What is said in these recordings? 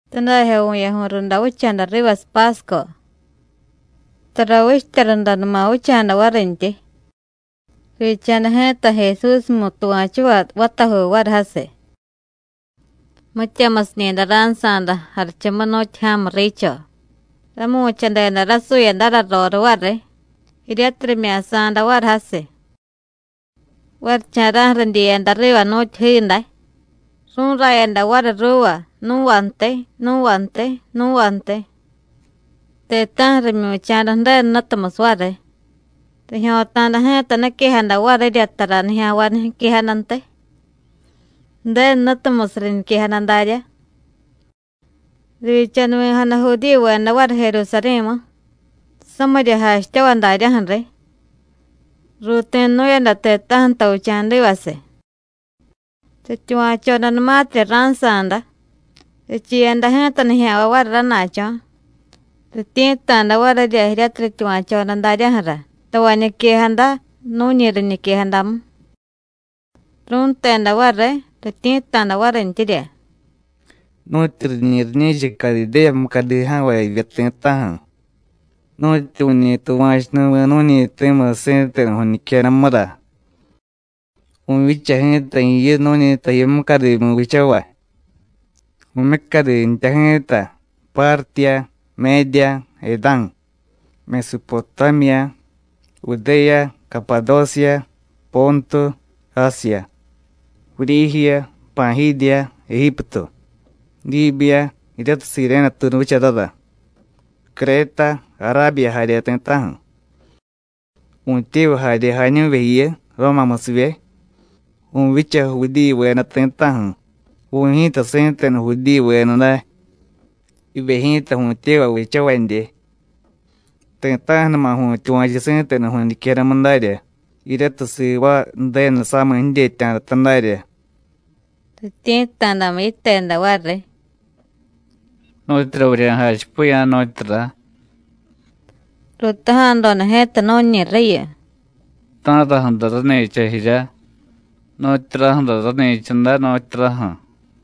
Tadajyo vu̱yaju̱y runda vicha̱da rivasiy Pásco. Tara vichtya rundanuma vicha̱da varintyi. Rivyicha̱da ji̱ta Jesúsmu tuva̱chuvay vatajuu variy jasiy. Mityamusiñi̱day ra̱nsa̱da jarichumu nu̱tyu ja̱mu riicho, ramu̱chadeda rasuyadara roriy variy, jiryatiy rimya̱sa̱da variy jasiy. Varicha̱ra̱ju̱ ridyiyada riva nu̱tyu jiiday, ru̱rayada variy ruuva, nu̱vantiy, nu̱vantiy, nu̱vantiy. Ti̱ta̱ju̱ rimyu̱cha̱da Ju̱denu Jnutumusiy variy. Rijyo̱ta̱da ji̱ta niquejada varirya tara nijya̱nvay niquejadantiy, Ju̱denu Jnutumusiy riñiquejada daryá. Rivyichanuvi̱jada Judíyuveda variy Jerusarí̱mu, samirya jachityavay daryaju̱ riy. Ruuti̱nu̱yada ti̱ta̱ju̱ tavicha̱divasiy. Rityuva̱chodanumatirya ra̱nsa̱da, richiiyada ji̱ta nijya̱nvay variy rana̱cho̱, rityi̱tta̱da varirya jiryatiy rityuva̱choda daryaju̱ra tavay niquejada nu̱ñi riñiquejadamu. Ru̱nteda variy, rityi̱tta̱da varintyirya: “Nu̱tyu riñi̱ riñi̱cha Cadidéya mucadi ja̱nvay jivye ti̱ta̱ju̱, nu̱tyu vu̱ñi tuva̱chunuvi̱ nu̱ñi ti̱musiy si̱tenu vu̱ñiquejadamura. Vu̱vyicha ji̱ta jiyu nu̱ñi taji mucadimu vichavay. Vu̱myucadi jtya ji̱ta Pártiya, Médiya, Edá̱, Mesupotámiya, Judéya, Capadósiya, Póntu, Ásiya, Vuryíjiya, Pa̱jídiya, Ejíptu, Díbiya jiryatiy Siréne tuunu vicharara, Créta, Arábiya jarye ti̱ta̱ju̱. Vu̱tyevay jarye jañu̱vye jiyu, Rómamusivye. Vu̱vyicha Judíyuveda ti̱ta̱ju̱, vu̱y ji̱ta si̱tenu Judíyuveda day, jivye ji̱ta vu̱tyevay vichavadye. Ti̱ta̱ju̱numa vu̱tyuva̱chu si̱tenu vu̱ñiquejadamu darya jiryatiy sivaay Ju̱denu samiy jidyetya̱data darya.” Rityi̱tta̱damu yiteda variy: “¿Nu̱tyura vurya̱jachipiya̱, nu̱tyura?” Ruutaja̱doda ji̱ta nu̱ñi riyu: “¿Ta̱raju̱ra rani̱cha jirya? ¿Nu̱tyuraju̱ra rani̱cha day, nu̱tyuraju̱?”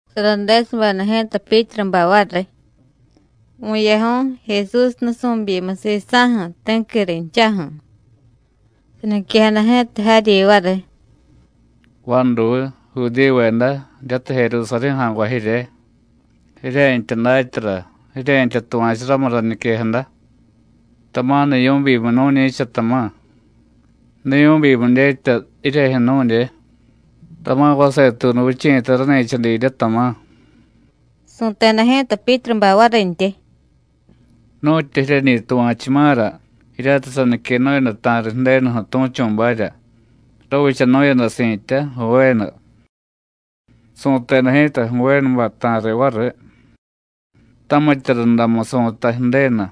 Saradesubeda ji̱ta Pyítrubay variy, vu̱yaju̱y Jesús nusu̱byimiy sisa̱ju̱, ti̱qui rinchaju̱, saniquejada ji̱ta jaryi variy: “Vaduy, Judíyuveda, jiryatiy Jerusarí̱ ja̱nvay jirye: jirye̱ntya datyara, jirye̱ntya tuva̱chu ramu rañiquejada. Tama̱ niyu̱byimiy nu̱ñi̱cha, tama̱. Niyu̱byimiy dyetya jiryejyu̱ nu̱dye. Tama̱ vasetuunu vichi̱ta rani̱cha didye, tama̱.” Su̱teda ji̱ta Pyítrubay varintyi: “Nu̱tyu jiryeñi tuva̱chuma̱ra jiryatiy saniquenu̱yada ta̱riy Ju̱denuju̱ tu̱chu̱barya, ravichanu̱yada si̱tya Jovénu. Su̱teda ji̱ta Jovénubay ta̱riy variy: Tamitya rundamu, su̱tay Ju̱denu,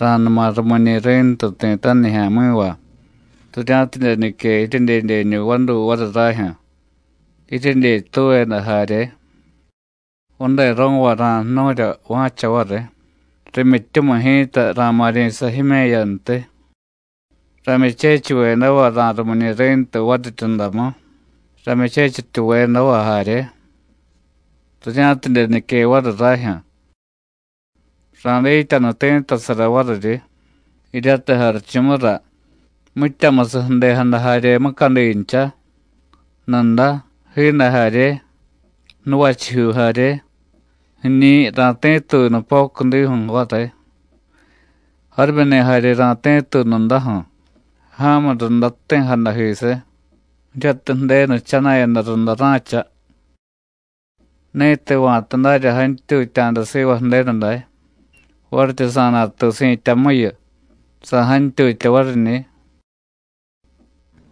ra̱numa rumiñi̱ ri̱ntu ti̱ta̱ju̱ nijya̱mi̱va, rirya̱tidye nique jiryedyedyeñu vaduy variy rajyu̱, jiryedyetuveda jarye. Vadero̱vay ra̱jnu̱rya va̱cha variy, rimyityumiy ji̱ta ra̱ma̱ryi̱sa jime̱yantiy. Ramyuchechivyedava ra̱rumiñi̱ Ri̱ntu variryundamu, ramyuchechityuvedava jarye, rirya̱tidye nique variy rajyu̱. Ra̱dityanu ti̱ttasara variryi, jiryatiy jarichumura, mityamusiy ju̱dejada jarye mucadincha: nuda, jiiday jarye, nuvachijyuu jarye. Jiñi̱ ra̱ti̱tuy nupocudiju̱ variy, jarimyuni̱ jarye ra̱ti̱tuy nudaju̱, ja̱mu runda jti̱jadajisiy, jiryatiy Ju̱denu jchana̱yada runda ra̱cha. Ni̱tiy va̱ta darya jantyutya̱da siva Ju̱denu day, varityi sa̱natuy si̱tyamuyu, sa̱jantyutya variñi̱.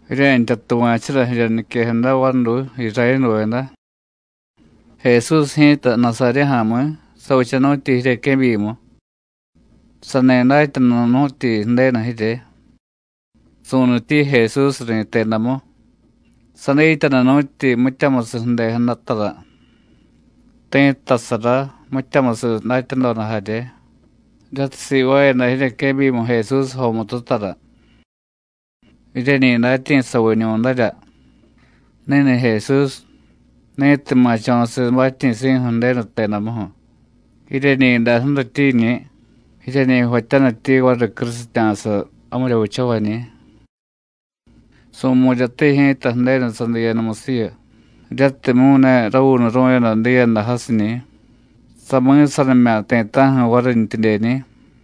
Jirye̱ntya tuva̱chura jirya niquejada, vaduy, Irayénuveda. Jesús ji̱ta, Nasaryé ja̱mi̱, savichanu̱tyi jiryequebyimu. Sani datyanunu̱tyi Ju̱denu jirye: Su̱nityi Jesús ri̱tedamu. Sadityanunu̱tyi mityamusiy ju̱dejadatara, ti̱ttasara, mityamusiy datyadoda jarye jiryatiy sivaayada jiryequebyimu Jesús jomututara. Jiryeñi datyi̱saviñu̱darya. Ni̱ni̱ Jesús, ni̱tiy ma̱cho̱siy batyi̱si̱ju̱ Ju̱denu jtedamuju̱, jiryeñi̱day ju̱rityiñi̱, jiryeñi jvatyanityi variy crusitya̱sa jamirya vichavañi̱. Su̱mu̱ryatiy ji̱ta Ju̱denu sadiiyadamusiyu, jiryatimyu̱ ne ravuunuru̱yada diiyada jasiñi̱, sami̱sanimya̱ ti̱ta̱ju̱ varintyidyeñi̱.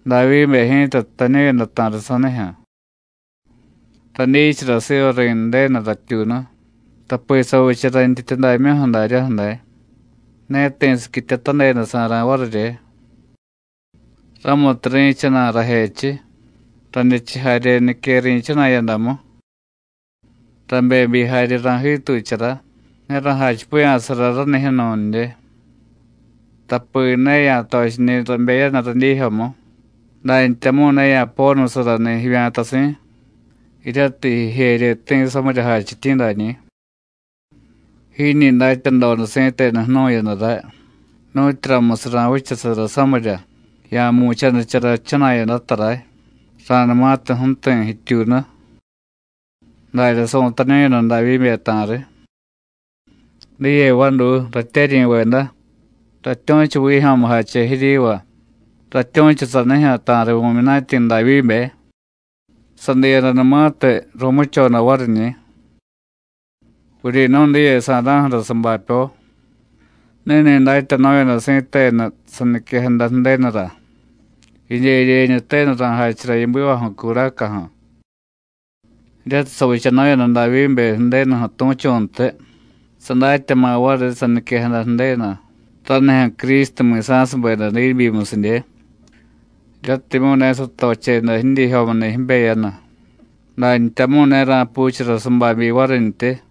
Davyíbe ji̱ta jtañu̱yada ta̱riy sanijyu̱: Radyichara siva Ri̱ndenu ratyuunu, tapi savicha rayntyityudamyuju̱ daryaju̱ day, ne ti̱ siquityatadedasa̱ra̱ varirye. Ramutiy rí̱chana̱y rajechiy, radyechiy jarye nique ri̱chana̱yadamu. Rabebyi jarye ra̱jiituchara, ne ra̱jachipiya̱sara ranijyu̱ nu̱ndye, tapi ne ya̱tochiñi̱ rabeyanu radyiijyomu, dantyamu̱y ne ya̱ponusarani̱ jivya̱tasi̱, jiryatiy jijeryeti̱ samirya jachityi̱ dañi̱. Jiñi datyadoda si̱tenu jnu̱yada ray, nu̱tyuramusiy ra̱vichasara samirya, ya̱mu̱chanichara jichana̱yadata ray ra̱numatiy ju̱ti̱ jityuunu. Darya su̱tañu̱yada Davyíbe ta̱riy. Diye vaduy, ratyeryi̱veda, ratyu̱chu vijyo̱mujache jiryiva, ratyu̱chu sanijyu̱ ta̱riy vu̱myunatyi̱ Davyíbe: sadiiyadanumatiy, ru̱muchoda variñi̱. Vuryi̱nu̱y diye sa̱ra̱ju̱ra sabapyo. Ni̱ni̱ datyanu̱yada si̱tenu saniquejada Ju̱denura: Jidyedyeñu tenu ra̱jachara yibivaju̱ curacaju̱. Jiryatiy savichanu̱yada Davyíbe Ju̱denuju̱ tu̱chu̱ntiy, sadatyama̱ variy saniquejada Ju̱denu ranijyu̱ Crístu mi̱sa̱subeda diibyimusidye, jiryatimyu̱ ne satocheda jidyiijyomuni̱ jibeyanu, dantyamu̱y ne ra̱puuchara sababyi varintyi.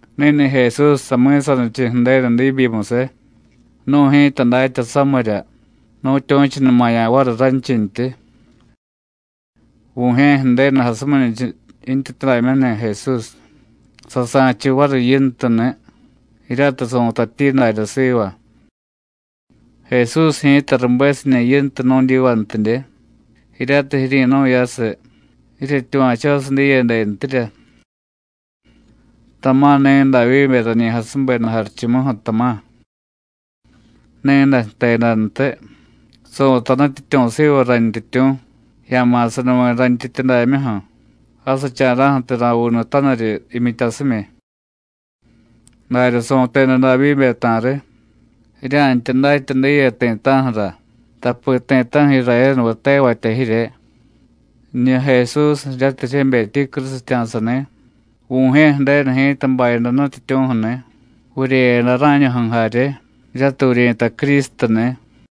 Ni̱ni̱ Jesús sami̱sanichiy Ju̱denu diibyimusiy, nu̱y ji̱ta datya samirya, nu̱tyu̱chunumaya̱ variy ranchintyi. Vu̱jye̱ Ju̱denu jasuminichiy yintyityudamyuju̱ni̱ Jesús, sasa̱chiy variy Yintuni̱, jiryatiy su̱tatyi darya siva. Jesús ji̱ta rubesiñi̱ Yintu nu̱dyivantidye, jiryatiy jiryi̱nu̱yasiy, jiryetyuva̱chosiy diyedentirya. Tama̱ ni̱ Davyíbe rañi jasubeda jarichumuju̱, tama̱. Ni̱day jtedantiy: Su̱tay Nutyityu̱ siva Rayntyityu̱: Ya̱ma̱sanuvi̱ rayntyityudamyuju̱, jasicha̱ra̱ju̱tiy ra̱vuunutaniryi jimyityasimyi. Darya su̱teda Davyíbe ta̱riy. Jirya̱ntya datya diye ti̱ta̱ju̱ra, tapi ti̱ta̱ju̱ Irayénuveda tevatya jirye: Jiñu Jesús jiryatiy jiryebetyi crusitya̱sani̱, Vu̱jye̱ Ju̱denu ji̱ta bayada Nutyityu̱ju̱ni̱, vuryeyada rá̱ñuju̱ jarye, jiryatiy vuryi̱tay Crístuni̱.”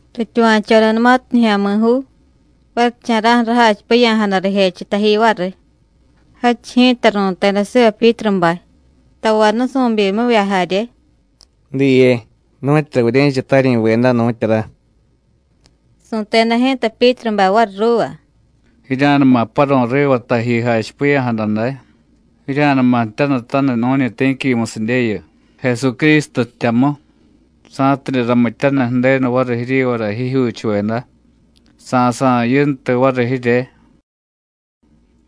Rityuva̱chodanumatiy nijya̱mi̱juu, varicha̱ra̱ju̱ rajachipiya̱jada rijechiy taji variy. Jadchiy ji̱ta ru̱teda siva Pyítrubay, tavay nusu̱byimivya jarye: “¿Diye nu̱tyura vurye̱cha, taryi̱veda, nu̱tyura?” Su̱teda ji̱ta Pyítrubay variy ruuva: “Jirya̱numa paru̱y riva taji jachipiya̱jada day, jirya̱numa jtyanutaniy nu̱ñi ti̱quimusidyeyu, Jesucrístu jtyamu, sa̱tidye ramityaniy Ju̱denu variy jiryivara jijyuuchuveda, sa̱sa̱y Yintu variy jirye.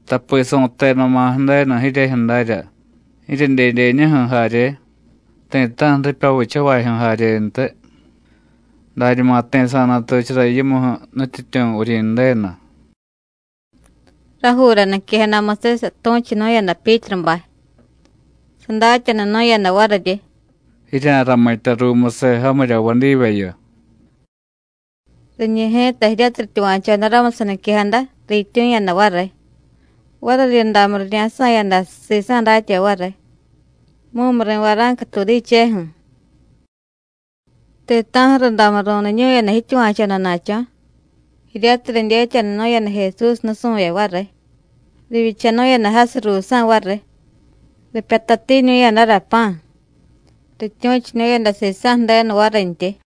Tapi su̱tedama̱ Ju̱denu jiryejyu̱ darya, jiryedyedyeñuju̱ jarye, ti̱ta̱ju̱ ripya vichavajyu̱ jaryentiy, dañuma ti̱ sa̱natuchara yimuju̱ Nutyityu̱, Vuryi̱ndenu.” Rajuura niquejadamusiy satu̱chunu̱yada Pyítrubay, sadatyanunu̱yada variryi: “Jirya̱ramitya ruumusiy jamirya jvaadyivyeyu.” Riñi̱ ji̱ta jiryatiy rityuva̱choda ramu saniquejada, riityu̱yada variy. Variryundamu rirya̱sa̱yada sisa̱ datyavay variy, mumuri̱ vara̱nca tuudicheju̱. Ti̱ta̱ju̱ rundamu ru̱niñu̱yada jityuva̱chodana̱cho̱, jiryatiy ridyetyanunu̱yada Jesús nusu̱vye variy, rivyichanu̱yada jasiy ruusa̱ variy, ripyatatiñu̱yadara pa̱, rityu̱chunu̱yada sisa̱ Ju̱denu varintyi.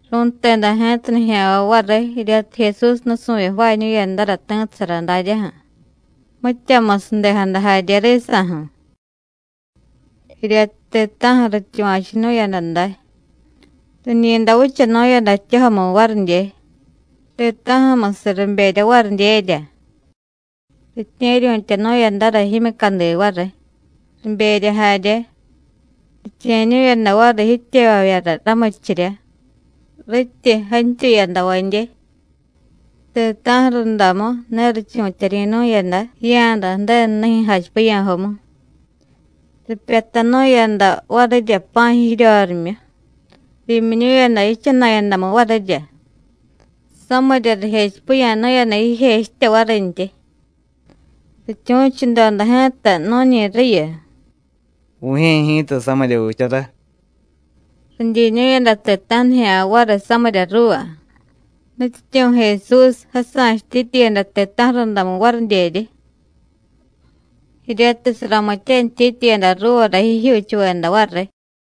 Ru̱nteda ji̱ta nijya̱nvay variy jiryatiy Jesús nusu̱vye jvaañu̱yadara ti̱ttasara daryaju̱, mityamusiy ju̱dejada jarye risa̱ju̱. Jiryatiy ti̱ta̱ju̱ rityuva̱chunu̱yada day, riñi̱day vichanu̱yada ji̱tyojomu varidye. Ti̱ta̱ju̱musiy riberya varidyerya. Ritye̱ryu̱tyanu̱yadara jimyucadi variy, riberya jarye, riche̱ñu̱yada variy jityevavyara ramurichirya, ritiy jantyuyadavadye. Ti̱ta̱ju̱ rundamu ne richu̱tyaryi̱nu̱yada jiya̱da Ju̱denu nijyu̱ jachipiya̱jomu. Ripyatanu̱yada varirya pa̱ jiryorimyu, riimyiñu̱yada jichana̱yadamu varirya, samirya rijechipiya̱nu̱yada jijechitya varintyi. Rityu̱chudoda ji̱ta nu̱ñi riyu: “Vu̱jye̱ ji̱ta samirya vichara.” Ridyiñu̱yada ti̱ta̱ju̱ nijya̱nvay variy samirya ruuva. Nutyityu̱ Jesús jasa̱chutityiyada ti̱ta̱ju̱ rundamu varidyeryi, jiryatiy saramityanityityiyada ruuvara jijyuuchuveda variy.